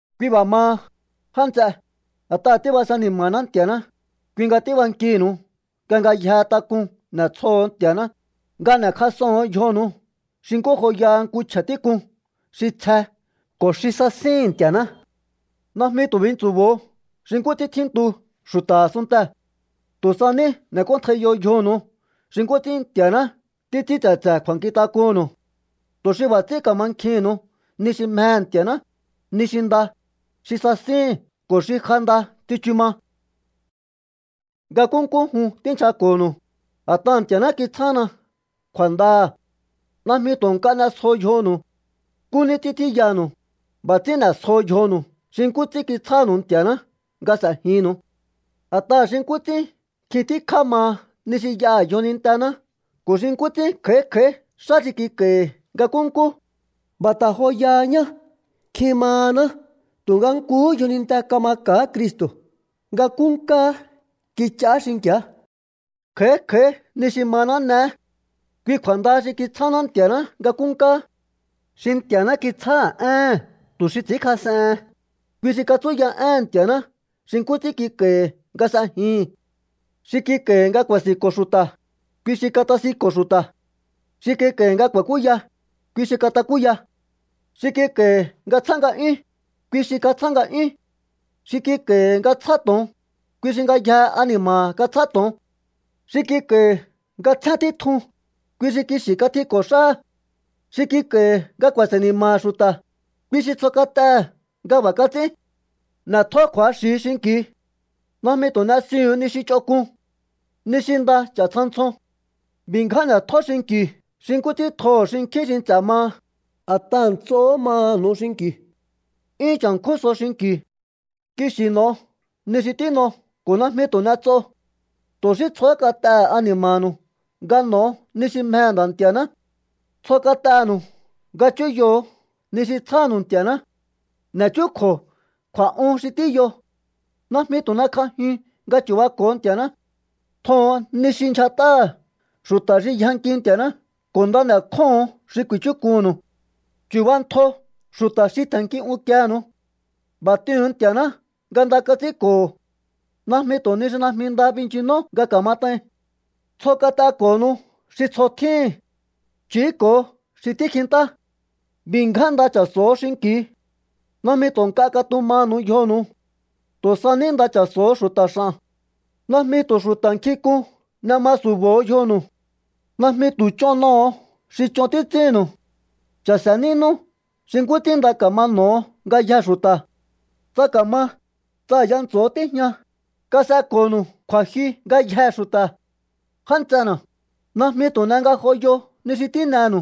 Kui b'a̱ maha, já nts'e, a̱t'aha̱ tíbase ni̱ma̱ná Nti̱a̱ná, kui nga tíbankihi̱nu̱u nga ngayjehe tak'un n'e̱tsjoho̱o Nti̱a̱ná, nga n'e̱kjas'oho̱on yjonu̱u xi nkú joyaha nku chje̱ tík'un xi tsje ko̱ xi sasíhi̱n Nti̱a̱ná. Najmi tu̱ bintsu̱bo̱o xi nkú ts'ín tjíntu xu̱ta̱ a̱sunntee̱. Tu̱ sa ní n'e̱k'óntjaiyo yjonu̱u xi nkú ts'ín Nti̱a̱ná títs'ín tse̱tse̱ kju̱a̱nkjintak'unnu̱u, tu̱ xi b'a̱ ts'ín ka̱mankjihi̱nnu̱u ni xi mjehe̱ Nti̱a̱ná, ni xi nda, xi sasíhi̱n ko̱ xi ja nda tsichu ma. Nga nkúnkú jun tínchjako̱nu̱u, a̱t'aha̱ Nti̱a̱ná kitsjána kju̱a̱ndaha̱. Najmi tu̱ nk'a n'esjo yjonu̱u. Nkú ní ts'ín tjíyanu̱u. B'a̱ ts'ín n'e̱sjo yjonu̱u xi nkú ts'ín kitsjánu̱u Nti̱a̱ná nga s'e̱jinnu̱u. A̱t'aha̱ xi nkú ts'ín nkjin tíkjá maha ni xi y'aha̱ yjonintená ko̱ xi nkú ts'ín kj'a̱í kj'a̱í xá xi kik'a̱hi̱ nga nkúnkú, b'a̱ ta̱ joyaha ñá. Nkjin mahaná tu̱nga nkuhú yjoninte kamaka̱á Cristo̱. Nga nkúnkáá kich'aá xinki̱á. Kj'a̱í kj'a̱í ni xi maná n'eé. Kui kju̱a̱nda xi kitsjáná Nti̱a̱ná nga nkúnkáá. Xi Nti̱a̱ná kitsjáha̱ éhe̱n tu xi ts'i̱ínkjas'ehen, kui xi katsúya éhe̱n Nti̱a̱ná xi nkú ts'ín kik'a̱i̱hi̱ nga s'ejihi̱n. Xi kik'a̱i̱hi̱ nga ku̱a̱si̱nko̱ xu̱ta̱, kui xi katasinko̱ xu̱ta̱. Xi kik'a̱i̱hi̱ nga ku̱a̱kúya, kui xi katakúya. Xi kik'a̱i̱hi̱ nga tsjá nga'yún, kui xi katsjá nga'yún. Xi kik'a̱i̱hi̱ nga tsjá to̱on, kui xi ngayjehe ani̱ma̱ha̱ katsjá to̱on. Xi kik'a̱i̱hi̱ nga tsjén títjun, kui xi kixi̱ katjiko̱ xáha̱. Xi kik'a̱i̱hi̱ nga ku̱a̱se̱ ni̱ma̱ha̱ xu̱ta̱, kui xi tsjo kat'ehe̱ nga b'a̱ kats'ín. N'e̱tjó kju̱axi̱ xinki̱u. Najmi tu̱ n'esiuhu̱un ni xi ch'onk'un. Ni xi nda ch'a̱ ntsja ntsjon. B'i̱ ngján n'e̱tjó xinki̱u xi nkú ts'ín tjoho̱ xinkjín xi nts'e̱ maha, a̱t'aha̱ nts'ohó maha̱nu̱u xinki̱u. 'Yún cha̱nkjún so xinki̱u. Kixi̱ n'o̱o ni xi tín'o ko̱ najmi tu̱ n'ets'o. Tu̱ xí tsjohó kat'ehe̱ ani̱ma̱nu̱u nga n'o̱o ni xi mjehe̱ Nda̱ Nti̱a̱ná. Tsjo kat'enu̱u nga chúyoho̱o ni xi tsjánu̱u Nti̱a̱ná. N'e̱chúkju̱o kju̱a̱'un xi tíyo. Najmi tu̱ n'ekj'ajiun nga chu̱bako̱o Nti̱a̱ná. Tjoho̱on ni xi ndyjat'áha̱ xu̱ta̱ xi yjanki Nti̱a̱ná ko̱ nda n'e̱kjóho̱on xi ku̱i̱chúk'unnu̱u. Chu̱bantjo xu̱ta̱ xi tje̱nnki unkienu̱u. B'a̱ t'ihu̱un Nti̱a̱ná nga nda kats'ínko̱ho̱. Najmi tu̱ ni xi najmi nda binchinó nga ka̱mat'ain. Tsjo kat'eko̱nu̱u xi tsjo tjíhi̱n. Ch'i̱íko̱ xi tíkjintá. B'i̱ ngján nda cha̱so̱ho̱ xinki̱u. Najmi tu̱ nk'a katumanu̱u yjonu̱u. Tu̱ sa ní nda cha̱so̱ho̱ xu̱ta̱ x'a̱n. Najmi tu̱ xu̱ta̱ nkjink'un n'e ma su̱bo̱o yjonu̱u. Najmi tu̱ ch'on n'oho̱o xi ch'on títs'ínnu̱u. Cha̱se̱ nínú xi nkú ts'ín nda ka̱ma n'o̱ho̱ ngayjee̱ xu̱ta̱. Tsa ka̱ma, tsa a̱ya ntso̱o tíjña, kas'eko̱nu̱u kju̱a̱jyu ngayjee̱ xu̱ta̱. Já nts'ena̱, najmi tu̱ n'e ngajoyo ni xi tín'enu̱u.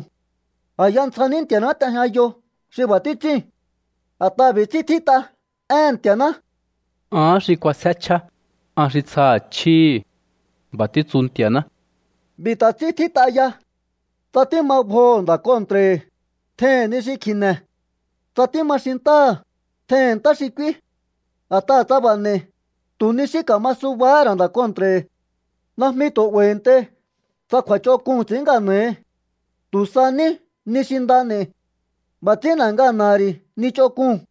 A̱ya ntsja ní Nti̱a̱ná t'ejñayo xi b'a̱ títs'íu̱n. A̱t'aha̱ b'i̱ ts'ín tjít'a éhe̱n Nti̱a̱ná: “Ahán xi k'uasjé chjíá, an xi tsjaha̱ chjíhi̱. B'a̱ títsu Nti̱a̱ná.” B'i̱ ta̱ ts'ín tjít'a ya: “Tsa tíma bjoho̱ nda̱ kontra̱hi̱, tjeihi̱n ni xi kji̱ne̱. Tsa tíma xintáha̱, tjeihi̱n ntá xi k'úí. A̱t'aha̱ tsa b'a̱ n'e̱i̱, tu̱ ni xí ka̱ma subahá ra̱ nda̱ kontra̱hi̱.” Najmi tu̱ 'ba̱i̱ntei tsa kju̱a̱ch'onk'uu̱n xi ts'i̱ín ngana̱hi. Tu̱ sa ní ni xi nda n'e̱i̱. B'a̱ ts'ín n'e̱ ngana̱ha̱ ri̱ ni ch'onk'uu̱n.